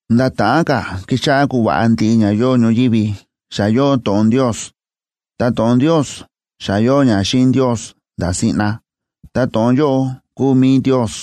Nda̱ ta̱ꞌán ka̱ kixáꞌá kuva̱ꞌa ndiꞌi ña yóo ñoyívi, xa yóo To̱ꞌon Ndios. Ta To̱ꞌon Ndios xa yóo ña xíꞌin Ndios nda̱ siꞌna, ta To̱ꞌon yóꞌo kúu mi̱i Ndios.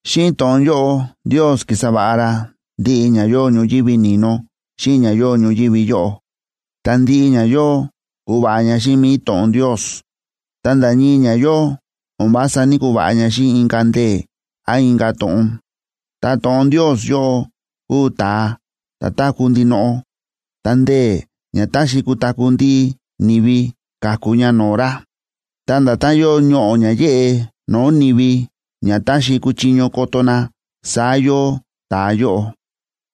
Xíꞌin To̱ꞌon yóꞌo Ndios ki̱sa va̱ꞌa ra ndiꞌi ña yóo ñoyívi ni̱no xíꞌin ña yóo ñoyívi yóꞌo. Ta ndiꞌi ña yóo, ku̱va̱ꞌa ña xíꞌin mi̱i To̱ꞌon Ndios. Ta nda̱ ñii ña yóo, o̱n vása ní‑kuva̱ꞌa ña xíꞌin inka̱ ndee̱ án inka̱ to̱ꞌon. Ta To̱ꞌon Ndios yóꞌo kúu ta̱a ta̱ táku̱ ndinoꞌo, ta ndee̱ ña táxi kutaku̱ ndiꞌi ni̱vi, káku ña no̱o̱ ra. Ta nda̱tán yóo ñoꞌo̱ ña yéꞌe no̱o̱ ni̱vi ña táxi kuchiño koto na, saá yóo ta̱a yóꞌo.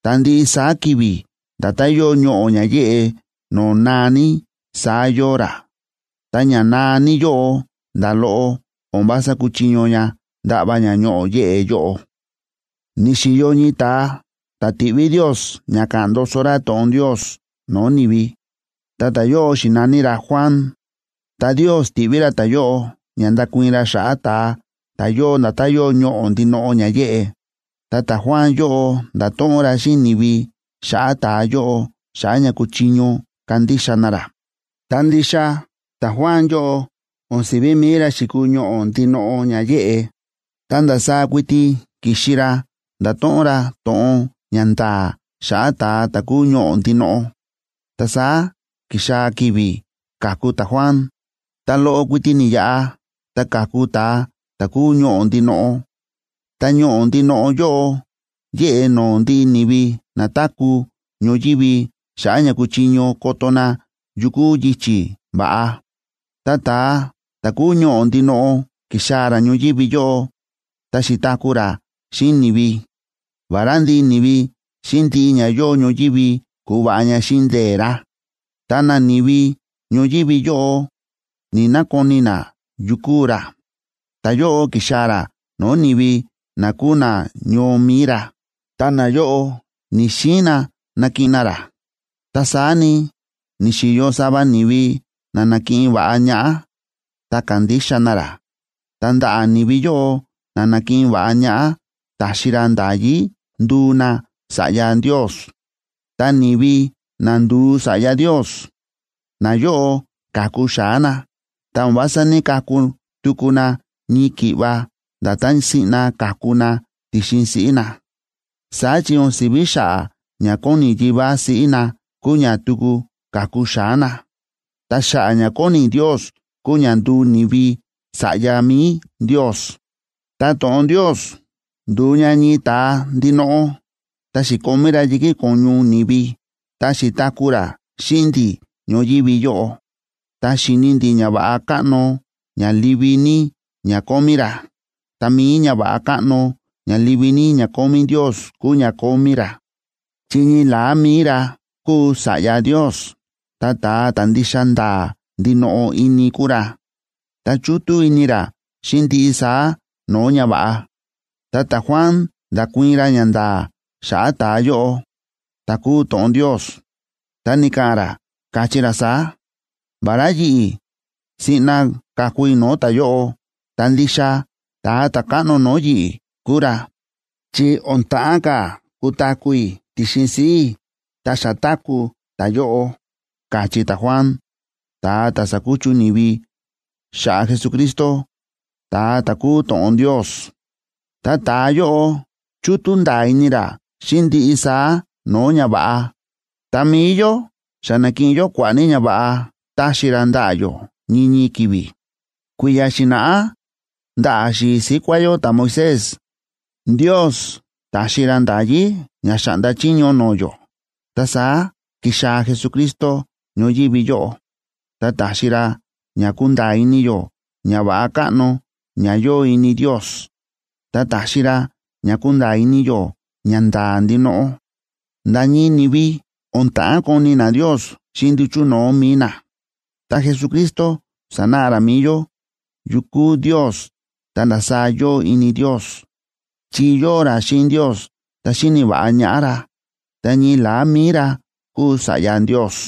Ta ndiꞌi saá ki̱vi̱ nda̱tán yóo ñoꞌo̱ ña yéꞌe no̱o̱ naa ní, saá yóo ra, ta ña naa ní yóꞌo, nda̱ loꞌo o̱n vása kúchiño ña ndaꞌva ña ñoꞌo̱ yéꞌe yóꞌo. Ni̱xi̱yo ñii ta̱a ta̱ ti̱ꞌví Ndios ña ka̱ꞌa̱n ndoso ra to̱ꞌon Ndios no̱o̱ ni̱vi, ta ta̱yóꞌo xi̱na̱ní ra Juan. Ta Ndios ti̱ꞌví ra ta̱yóꞌo ña ndakuii̱n ra xa̱ꞌa̱ ta̱a ta̱ yóo nda̱tán yóo ñoꞌo̱ ndinoꞌo ña yéꞌe. Ta ta̱Juan yóꞌo nda̱to̱ꞌon ra xíꞌin ni̱vi xa̱ꞌa̱ ta̱a yóꞌo xa̱ꞌa̱ ña kuchiño kandixa na ra. Ta ndixa ta̱Juan yóꞌo o̱n si̱ví mi̱i ra xi̱kuu ñoꞌo̱ ndinoꞌo ña yéꞌe, ta ndasaá kuiti ki̱xi ra ndato̱ꞌon ra to̱ꞌon ña nda̱a̱ xa̱ꞌa̱ ta̱a ta̱ kúu ñoꞌo̱ ndinoꞌo. Ta saá ki̱xaa̱ ki̱vi̱ ka̱ku ta̱Juan, ta loꞌo kuiti ni̱yaꞌa, ta ka̱ku ta̱a ta̱ kúu ñoꞌo̱ ndinoꞌo. Ta ñoꞌo̱ ndinoꞌo yóꞌo yéꞌe no̱o̱ ndiꞌi ni̱vi na táku̱ ñoyívi xa̱ꞌa̱ ña kuchiño koto na yu kúu yichi̱ va̱ꞌa. Ta ta̱a ta̱ kúu ñoꞌo̱ ndinoꞌo ki̱xaa̱ ra ñoyívi yóꞌo, ta xi̱taku̱ ra xíꞌin ni̱vi. Vará ndiꞌi ni̱vi xíꞌin ndiꞌi ña yóo ñoyívi ku̱va̱ꞌa ña xíꞌin ndee̱ ra, ta nani̱vi ñoyívi yóꞌo ní‑nakoni na yu kúu ra. Ta̱yóꞌo ki̱xaa̱ ra no̱o̱ ni̱vi na kúu nañoo mi̱i ra, ta nayóꞌo ni̱‑xiin na nakiꞌin na ra. Ta saá ni, ni̱xi̱yo sava ni̱vi na na̱kiꞌin va̱ꞌa ñaꞌá, ta ka̱ndixa na ra. Ta ndaꞌa̱ ni̱vi yóꞌo na na̱kiꞌin va̱ꞌa ñaꞌá, ta̱xi ra nda̱yí nduu na sa̱ꞌya Ndios. Ta ni̱vi na ndu̱u sa̱ꞌya Ndios, nayóꞌo ka̱ku xa̱á na, ta o̱n vása ní‑kaku tuku na ñii ki̱ꞌva nda̱tán siꞌna ka̱ku na ti̱xin siꞌí na. Saá chi o̱n si̱ví xa̱ꞌa̱ ña kóni yivá siꞌí na kúu ña tuku ka̱ku xa̱á na. Ta xa̱ꞌa̱ ña kóni Ndios kúu ña ndu̱u ni̱vi sa̱ꞌya mi̱i Ndios. Ta To̱ꞌon Ndios ndu̱u ña ñii ta̱a ndinoꞌo, ta xi̱komí ra yi̱kí ko̱ñu ni̱vi, ta xi̱taku̱ ra xíꞌin ndi̱ ñoyívi yóꞌo. Ta xi̱ni ndi̱ ñava̱ꞌa káꞌno ña livi ní ña kómí ra. Ta mi̱i ñava̱ꞌa káꞌno ña livi ní ña kómí Ndios kúu ña kómí ra, chi ñii la̱á mi̱i ra kúu Sa̱ꞌya Ndios, ta ta̱a ta̱ ndixa nda̱a̱ ndinoꞌo ini kúu ra, ta chútú ini ra xíꞌin ndiꞌi saá no̱o̱ ñava̱ꞌa. Ta ta̱Juan nda̱kuii̱n ra ñanda̱a̱ xa̱ꞌa̱ ta̱a yóꞌo ta̱ kúu To̱ꞌon Ndios, ta ni̱ka̱ꞌa̱n ra, káchí ra saá: ―Vará yi̱ꞌi̱ siꞌna ka̱ku i̱ no̱o̱ ta̱yóꞌo, ta ndixa ta̱a ta̱ káꞌno no̱o̱ yi̱ꞌi̱ kúu ra, chi o̱n ta̱ꞌán ka̱ kutaku̱ i̱ ti̱xin siꞌí i̱, ta xa táku̱ ta̱yóꞌo ―káchí ta̱Juan, ta̱a ta̱ sákuchu ni̱vi, xa̱ꞌa̱ Jesucristo, ta̱a ta̱ kúu To̱ꞌon Ndios. Ta ta̱a yóꞌo, chútú nda̱a̱ ini ra xíꞌin ndiꞌi saá no̱o̱ ñava̱ꞌa. Ta mi̱i yó, xa nákiꞌin yó kua̱ꞌa̱ ní ñava̱ꞌa táxi ra ndaꞌa̱ yó ñii ñii ki̱vi̱. Kui̱ya̱ xi̱na̱ꞌá, ndaꞌa̱ xi̱i̱ síkuá yó ta̱Moisés, Ndios ta̱xi ra nda̱yí ña xa̱ꞌnda chiño no̱o̱ yó. Ta saá ki̱xaa̱ Jesucristo ñoyívi yóꞌo, ta ta̱xi ra ña kúnda̱a̱ ini yó ñava̱ꞌa káꞌno ña yóo ini Ndios, ta ta̱xi ra ña kúnda̱a̱ ini yó ñanda̱a̱ ndinoꞌo. Nda̱ ñii ni̱vi o̱n ta̱ꞌán koni na Ndios xíꞌin nduchu̱ no̱o̱ mi̱i na. Ta Jesucristo sa̱náꞌa ra mi̱i yó yu kúu Ndios ta ndasaá yóo ini Ndios, chi yóo ra xíꞌin Ndios ta xíni̱ va̱ꞌa ñaꞌá ra, ta ñii la̱á mi̱i ra kúu Sa̱ꞌya Ndios.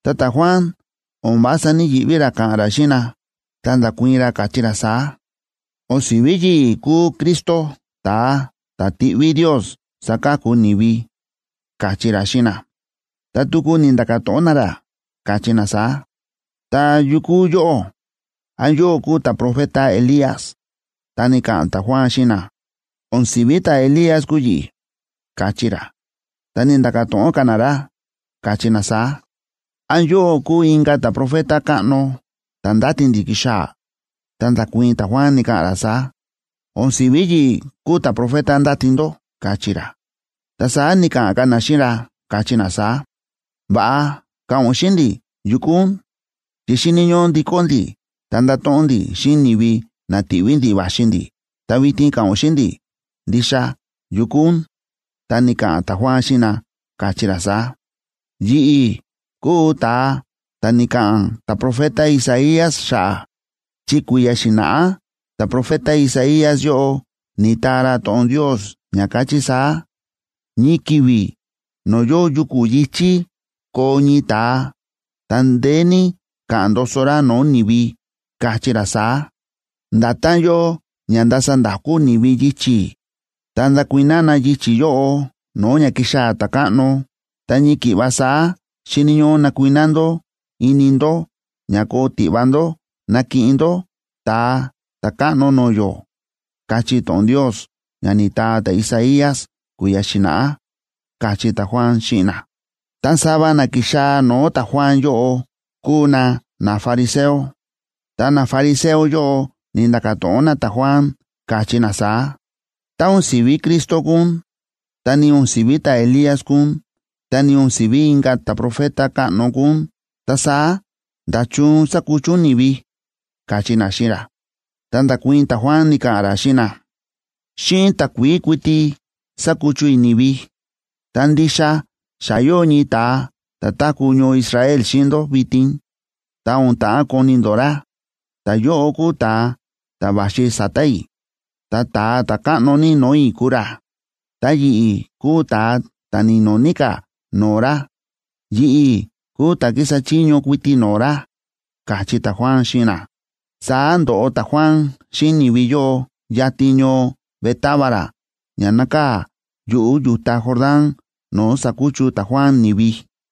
Ta ta̱Juan o̱n vása ní‑yiꞌví ra ka̱ꞌa̱n ra xíꞌin na, ta nda̱kuii̱n ra, káchí ra saá: ―O̱n si̱ví yi̱ꞌi̱ kúu Cristo, ta̱a ta̱ tiꞌví Ndios saka̱ku ni̱vi ―káchí ra xíꞌin na. Ta tuku ni̱nda̱ka̱ to̱ꞌon na ra, káchí na saá: ―¿Ta yu kúu yóꞌó? ¿Án yóꞌó kúu ta̱profeta Elías? Ta ni̱ka̱ꞌa̱n ta̱Juan xíꞌin na: ―O̱n si̱ví ta̱Elías kúu yi̱ꞌi̱ ―káchí ra. Ta ni̱nda̱ka̱ to̱ꞌon ka̱ na ra, káchí na saá: ―¿Án yóꞌó kúu inka̱ ta̱profeta káꞌno ta̱ ndáti ndi̱ kixaa̱? Ta nda̱kuii̱n ta̱Juan, ni̱ka̱ꞌa̱n ra saá: ―O̱n si̱ví yi̱ꞌi̱ kúu ta̱profeta ndáti ndó ―káchí ra. Ta saá ni̱ka̱ꞌa̱n ka̱ na xíꞌin ra, káchí na saá: ―Va̱ꞌa ka̱ꞌa̱n ún xíꞌin ndi̱ yu kúu ún, chi xíni̱ ñóꞌó ndikó ndi̱ ta ndato̱ꞌon ndi̱ xíꞌin ni̱vi na ti̱ꞌví ndi̱ va̱xi ndi̱. Ta vitin ka̱ꞌa̱n ún xíꞌin ndi̱ ndixa yu kúu ún. Ta ni̱ka̱ꞌa̱n ta̱Juan xíꞌin na, káchí ra saá: ―Yi̱ꞌi̱ kúu ta̱a ta̱ ni̱ka̱ꞌa̱n ta̱profeta Isaías xa̱ꞌa̱, chi kui̱ya̱ xi̱na̱ꞌá ta̱profeta Isaías yóꞌo ni̱taa ra to̱ꞌon Ndios ña káchí saá: Ñii ki̱vi̱ no̱o̱ yóo yuku̱ yi̱chí koo ñii ta̱a, ta ndeé ní ka̱ꞌa̱n ndoso ra no̱o̱ ni̱vi, kachí ra saá: “Nda̱tán yóo ña ndasa nda̱kú ni̱vi yichi̱, ta̱nda̱ kuiná na yichi̱ yóꞌo no̱o̱ ña kixaa̱ ta̱káꞌno, ta ñii ki̱ꞌva saá xíni̱ ñóꞌó nakuiná ndó ini ndó ña koo tiꞌva ndó nakiꞌin ndó Ta̱a Ta̱káꞌno no̱o̱ yó”, káchí to̱ꞌon Ndios ña ni̱taa ta̱Isaías kui̱ya̱ xi̱na̱ꞌá ―káchí ta̱Juan xíꞌin na. Ta sava na ki̱xaa̱ no̱o̱ ta̱Juan yóꞌo kúu na nafariseo, ta nafariseo yóꞌo ni̱nda̱ka̱ to̱ꞌon na ta̱Juan, káchí na saá: ―Tá o̱n si̱ví Cristo kúu ún, ta ni o̱n si̱ví ta̱Elías kúu ún, ta ni o̱n si̱ví inka̱ ta̱profeta káꞌno kúu ún, ta saá, ¿nda̱chun sákuchu ún ni̱vi? ―káchí na xíꞌin ra. Ta nda̱kuii̱n ta̱Juan, ni̱ka̱ꞌa̱n ra xíꞌin na: ―Xíꞌin takuií kuiti sákuchu i̱ ni̱vi. Ta ndixa xa yóo ñii ta̱a ta̱ táku̱ ñoo Israel xíꞌin ndó vitin, ta o̱n ta̱ꞌán koni ndó ra. Ta̱yóꞌo kúu ta̱a ta̱ va̱xi sa̱ta̱ i̱. Ta ta̱a ta̱ káꞌno ní no̱o̱ i̱ kúu ra, ta yi̱ꞌi̱ kúu ta̱a ta̱ ni̱no̱ ní ka̱ no̱o̱ ra. Yi̱ꞌi̱ kúu ta̱ kísa chiño kuiti no̱o̱ ra ―káchí ta̱Juan xíꞌin na. Saá ndo̱ꞌo ta̱Juan xíꞌin ni̱vi yóꞌo yatin ñoo Betábaraa ña nákaa̱ yuꞌu̱ yu̱ta Jordán no̱o̱ sákuchu ta̱Juan ni̱vi.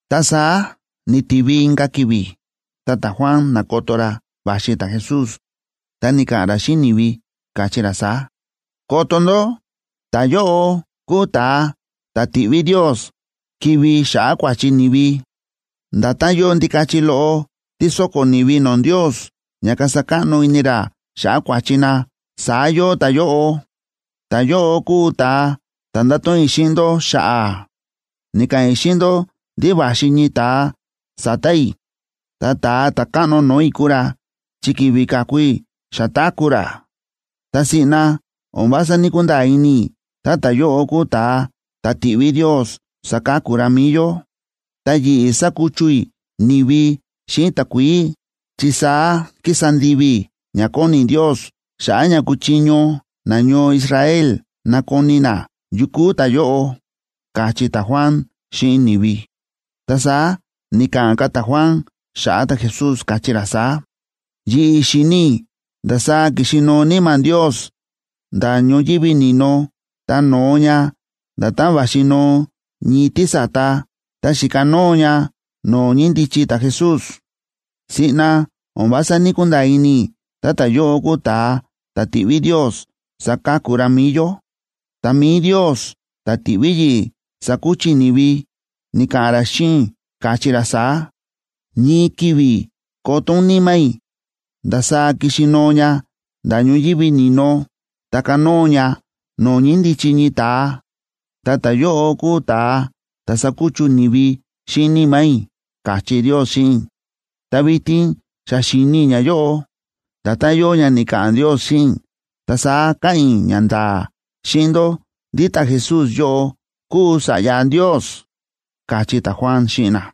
Ta saá ni̱tivi inka̱ ki̱vi̱, ta ta̱Juan na̱koto ra va̱xi ta̱Jesús, ta ni̱ka̱ꞌa̱n ra xíꞌin ni̱vi, káchí ra saá: ―¡Koto ndó! Ta̱yóꞌo kúu ta̱a ta̱ ti̱ꞌví Ndios kivi̱ xa̱ꞌa̱ kua̱chi ni̱vi. Nda̱tán yóo ndikachi loꞌo tí sóko̱ ni̱vi no̱o̱ Ndios ña kasa káꞌno ini ra xa̱ꞌa̱ kua̱chi na, saá yóo ta̱yóꞌo. Ta̱yóꞌo kúu ta̱a ta̱ nda̱to̱ꞌon i̱ xíꞌin ndó xa̱ꞌa̱. Ni̱ka̱ꞌa̱n i̱ xíꞌin ndó ndí va̱xi ñii ta̱a sa̱ta̱ i̱, ta ta̱a ta̱ káꞌno no̱o̱ i̱ kúu ra, chi ki̱vi̱ ka̱ku i̱, xa táku̱ ra. Ta siꞌna o̱n vása ní‑kunda̱a̱ ini i̱ tá ta̱yóꞌo kúu ta̱a ta̱ ti̱ꞌví Ndios saka̱ku ra mi̱i yó. Ta yi̱ꞌi̱ sákuchu i̱ ni̱vi xíꞌin takuií, chi saá kísa ndivi i̱ ña kóni Ndios xa̱ꞌa̱ ña kuchiño nañoo Israel nakoni na yu kúu ta̱yóꞌo ―káchí ta̱Juan xíꞌin ni̱vi. Ta saá ni̱ka̱ꞌa̱n ka̱ ta̱Juan xa̱ꞌa̱ ta̱Jesús, káchí ra saá: ―Yi̱ꞌi̱ xi̱ni i̱ ndasaá ki̱xi nóo Níma̱ Ndios nda̱ ñoyívi ni̱no, ta no̱o ña nda̱tán va̱xi noo ñii tísa̱ta, ta xi̱kanóo ña no̱o̱ ñíndichi ta̱Jesús. Siꞌna o̱n vása ní‑kunda̱a̱ ini i̱ tá ta̱yóꞌo kúu ta̱a ta̱ ti̱ꞌví Ndios saka̱ku ra mi̱i yó, ta mi̱i Ndios ta̱ ti̱ꞌví yi̱ꞌi̱ sakuchu i̱ ni̱vi, ni̱ka̱ꞌa̱n ra xíꞌin i̱, káchí ra saá: “Ñii ki̱vi̱ koto ún Níma̱ i̱ ndasaá kixi noo ña nda̱ ñoyívi ni̱no, ta kanóo ña no̱o̱ ñíndichi ñii ta̱a, ta ta̱yóꞌo kúu ta̱a ta̱ sakuchu ni̱vi xíꞌin Níma̱ i̱”, káchí Ndios xíꞌin i̱. Ta vitin xa xi̱ni i̱ ñayóꞌo nda̱tán yóo ña ni̱ka̱ꞌa̱n Ndios xíꞌin i̱, ta saá káꞌa̱n i̱ ñanda̱a̱ xíꞌin ndó ndí ta̱Jesús yóꞌo kúu Sa̱ꞌya Ndios ―káchí ta̱Juan xíꞌin na.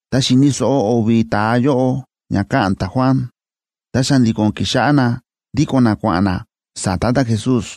Tá xi̱ni̱ so̱ꞌo o̱vi̱ ta̱a yóꞌo ña káꞌa̱n ta̱Juan, ta xa̱ndi̱ko̱n ki̱xáꞌá na ndíko̱n na kua̱ꞌa̱n na sa̱ta̱ ta̱Jesús.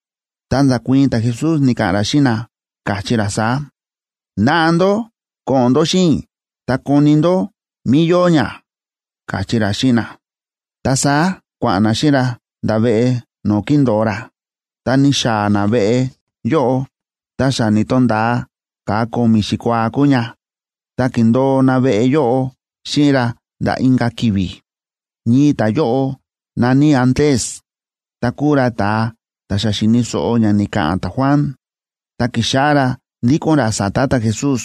Ta nda̱kuii̱n ta̱Jesús, ni̱ka̱ꞌa̱n ra xíꞌin na, káchí ra saá: ―Naꞌa ndó ko̱ꞌo̱n ndó xíꞌin i̱ ta koni ndó mí yóo ña ―káchí ra xíꞌin na. Ta saá kua̱ꞌa̱n na xíꞌin ra nda̱ veꞌe no̱o̱ kíndo̱o ra. Tá ni̱xaa̱ na veꞌe yóꞌo, ta xa ni̱to̱nda̱a ka̱a ko̱mi̱ xikuaa kúu ña,b ta ki̱ndo̱o na veꞌe yóꞌo xíꞌin ra nda̱ inka̱ ki̱vi̱. Ñii ta̱yóꞌo na̱ní Andrés, ta kúu ra ta̱a ta̱ xa xi̱ni̱ so̱ꞌo ña ni̱ka̱ꞌa̱n ta̱Juan, ta ki̱xáꞌá ra ndíko̱n ra sa̱ta̱ ta̱Jesús.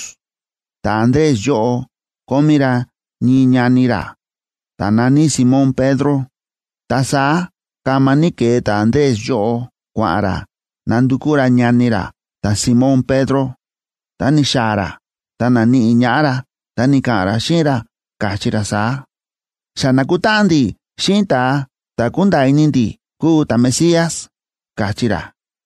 Ta̱Andrés yóꞌo kómí ra ñii ñani ra, ta̱ na̱ní Simón Pedro. Ta saá kama ní ke̱e ta̱Andrés yóꞌo kua̱ꞌa̱n ra nandukú ra ñani ra ta̱Simón Pedro. Tá ni̱xaa̱ ra ta na̱níꞌi ñaꞌá ra, ta ni̱ka̱ꞌa̱n ra xíꞌin ra, káchí ra saá: ―Xa na̱kutáꞌan ndi̱ xíꞌin ta̱a ta̱ kúnda̱a̱ ini ndi̱ kúu ta̱Mesías ―káchí ra.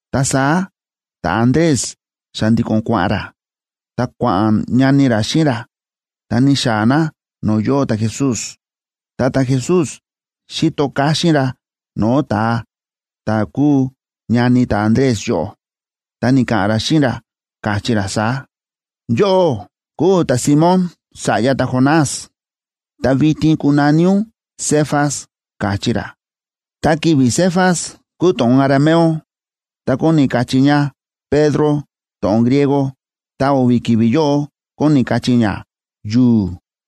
Ta saá ta̱Andrés xa̱ndi̱ko̱n kua̱ꞌa̱n ra, ta kua̱ꞌa̱n ñani ra xíꞌin ra, ta ni̱xaa̱ na no̱o̱ yóo ta̱Jesús. Ta ta̱Jesús xi̱to káxín ra no̱o̱ ta̱a ta̱ kúu ñani ta̱Andrés yóꞌo, ta ni̱ka̱ꞌa̱n ra xíꞌin ra, káchí ra saá: ―Yóꞌó kúu ta̱Simón, sa̱ꞌya ta̱Jonás. Ta vitin kunaní ún Cefas ―káchí ra. (Ta ki̱vi̱ Cefas kúu to̱ꞌon arameo, ta kóni kachí ña Pedro to̱ꞌon griego, ta o̱vi̱ ki̱vi̱ yóꞌo kóni kachí ña yu̱u̱.)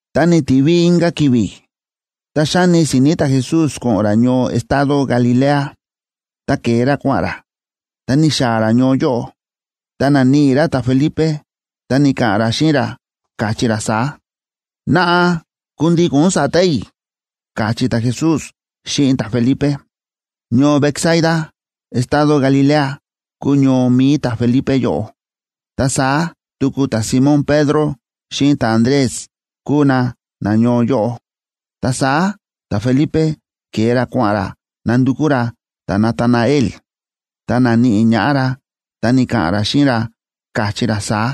Ta ni̱tivi inka̱ ki̱vi̱, ta xáni si̱ni̱ ta̱Jesús ko̱ꞌo̱n ra ñoo estado Galilea. Ta ke̱e ra kua̱ꞌa̱n ra, ta ni̱xaa̱ ra ñoo yóꞌo, ta na̱níꞌi ra ta̱Felipe. Ta ni̱ka̱ꞌa̱n ra xíꞌin ra, káchí ra saá: ―Naꞌa, kundíko̱n ún sa̱ta̱ i̱ ―káchí ta̱Jesús xíꞌin ta̱Felipe. Ñoo Betsaida estado Galilea kúu ñoo mi̱i ta̱Felipe yóꞌo. Ta saá tuku ta̱Simón Pedro xíꞌin ta̱Andrés kúu na nañoo yóꞌo. Ta saá ta̱Felipe ke̱e ra kua̱ꞌa̱n ra nándukú ra ta̱Natanael. Tá na̱níꞌi ñaꞌá ra, ta ni̱ka̱ꞌa̱n ra xíꞌin ra, káchí ra saá: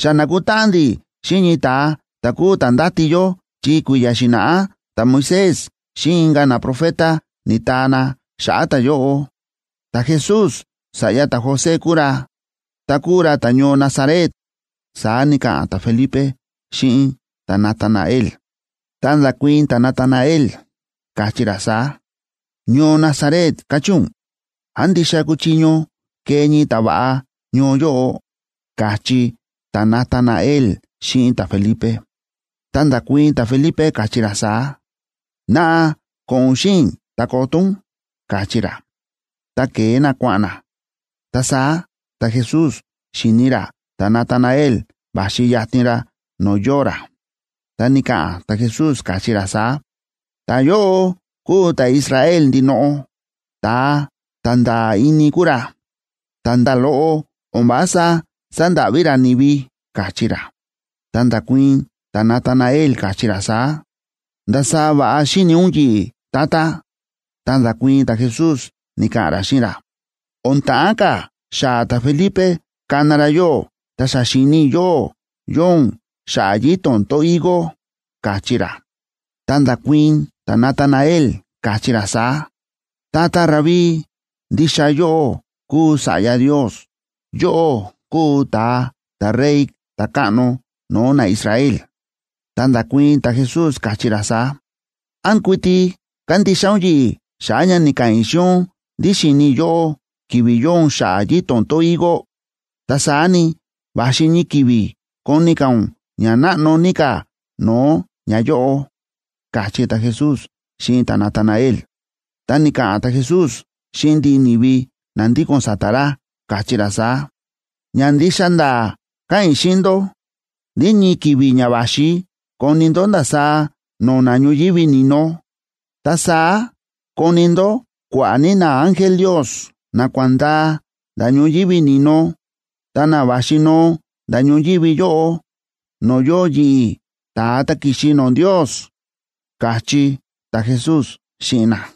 ―Xa na̱kutáꞌan ndi̱ xíꞌin ñii ta̱a ta̱ kúu ta̱ ndáti yó chi kui̱ya̱ xi̱na̱ꞌá ta̱Moisés xíꞌin inka̱ naprofeta ni̱taa na xa̱ꞌa̱ ta̱yóꞌo. Ta̱Jesús sa̱ꞌya ta̱José kúu ra, ta kúu ra ta̱ñoo Nazaret ―saá ni̱ka̱ꞌa̱n ta̱Felipe xíꞌin ta̱Natanael. Ta nda̱kuii̱n ta̱Natanael, káchí ra saá: ―Ñoo Nazaret, ¿káchí ún? ¿Án ndixa kúchiño kee ñii ta̱va̱ꞌa ñoo yóꞌo? ―káchí ta̱Natanael xíꞌin ta̱Felipe. Ta nda̱kuii̱n ta̱Felipe, káchí ra saá: ―Naꞌa ko̱ꞌo̱n ún xíꞌin i̱, ta koto ún ―káchí ra. Ta ke̱e na kua̱ꞌa̱n na. Ta saá ta̱Jesús xi̱ni ra ta̱Natanael va̱xi yatin ra no̱o̱ yóo ra, ta ni̱ka̱ꞌa̱n ta̱Jesús, káchí ra saá: ―Ta̱yóꞌo kúu ta̱Israel ndinoꞌo. Ta̱a ta̱ nda̱a̱ ini kúu ra, ta nda̱ loꞌo o̱n vása sandáꞌví ra ni̱vi ―káchí ra. Ta nda̱kuii̱n ta̱Natanael, káchí ra saá: ―¿Ndasaá va̱ꞌa xíni̱ ún yi̱ꞌi̱, Tata? Ta nda̱kuii̱n ta̱Jesús, ni̱ka̱ꞌa̱n ra xíꞌin ra: ―O̱n ta̱ꞌán ka̱ xaa̱ ta̱Felipe kana ra yóꞌó, ta xa xi̱ni i̱ yóꞌó, yóo ún xa̱ꞌa̱ yito̱n tón higo ―káchí ra. Ta nda̱kuii̱n ta̱Natanael, káchí ra saá: ―Tata Rabí, ndixa yóꞌó kúu Sa̱ꞌya Ndios, yóꞌó kúu ta̱a ta̱Rey, ta̱káꞌno no̱o̱ naIsrael. Ta nda̱kuii̱n ta̱Jesús, káchí ra saá: ―¿Án kuiti kándixa ún yi̱ꞌi̱ xa̱ꞌa̱ ña ni̱ka̱ꞌa̱n i̱ xíꞌin ún ndí xi̱ni i̱ yóꞌó ki̱vi̱ yóo ún xa̱ꞌa̱ yito̱n tón higo? Ta saá ni, va̱xi ñii ki̱vi̱ koni ka̱ ún ña náꞌno ní ka̱ no̱o̱ ñayóꞌo ―káchí ta̱Jesús xíꞌin ta̱Natanael. Ta ni̱ka̱ꞌa̱n ta̱Jesús xíꞌin ndiꞌi ni̱vi na ndíko̱n sa̱ta̱ ra, káchí ra saá: ―Ña ndixa nda̱a̱ káꞌa̱n i̱ xíꞌin ndó ndí ñii ki̱vi̱ ña va̱xi koni ndó ndasaá no̱na̱ ñoyívi ni̱no, ta saá koni ndó kua̱ꞌa̱ ní naángel Ndios na kua̱ꞌa̱n ndaa nda̱ ñoyívi ni̱no ta na va̱xi noo nda̱ ñoyívi yóꞌo, no̱o̱ yóo yi̱ꞌi̱, ta̱a ta̱ ki̱xi no̱o̱ Ndios ―káchí ta̱Jesús xíꞌin na.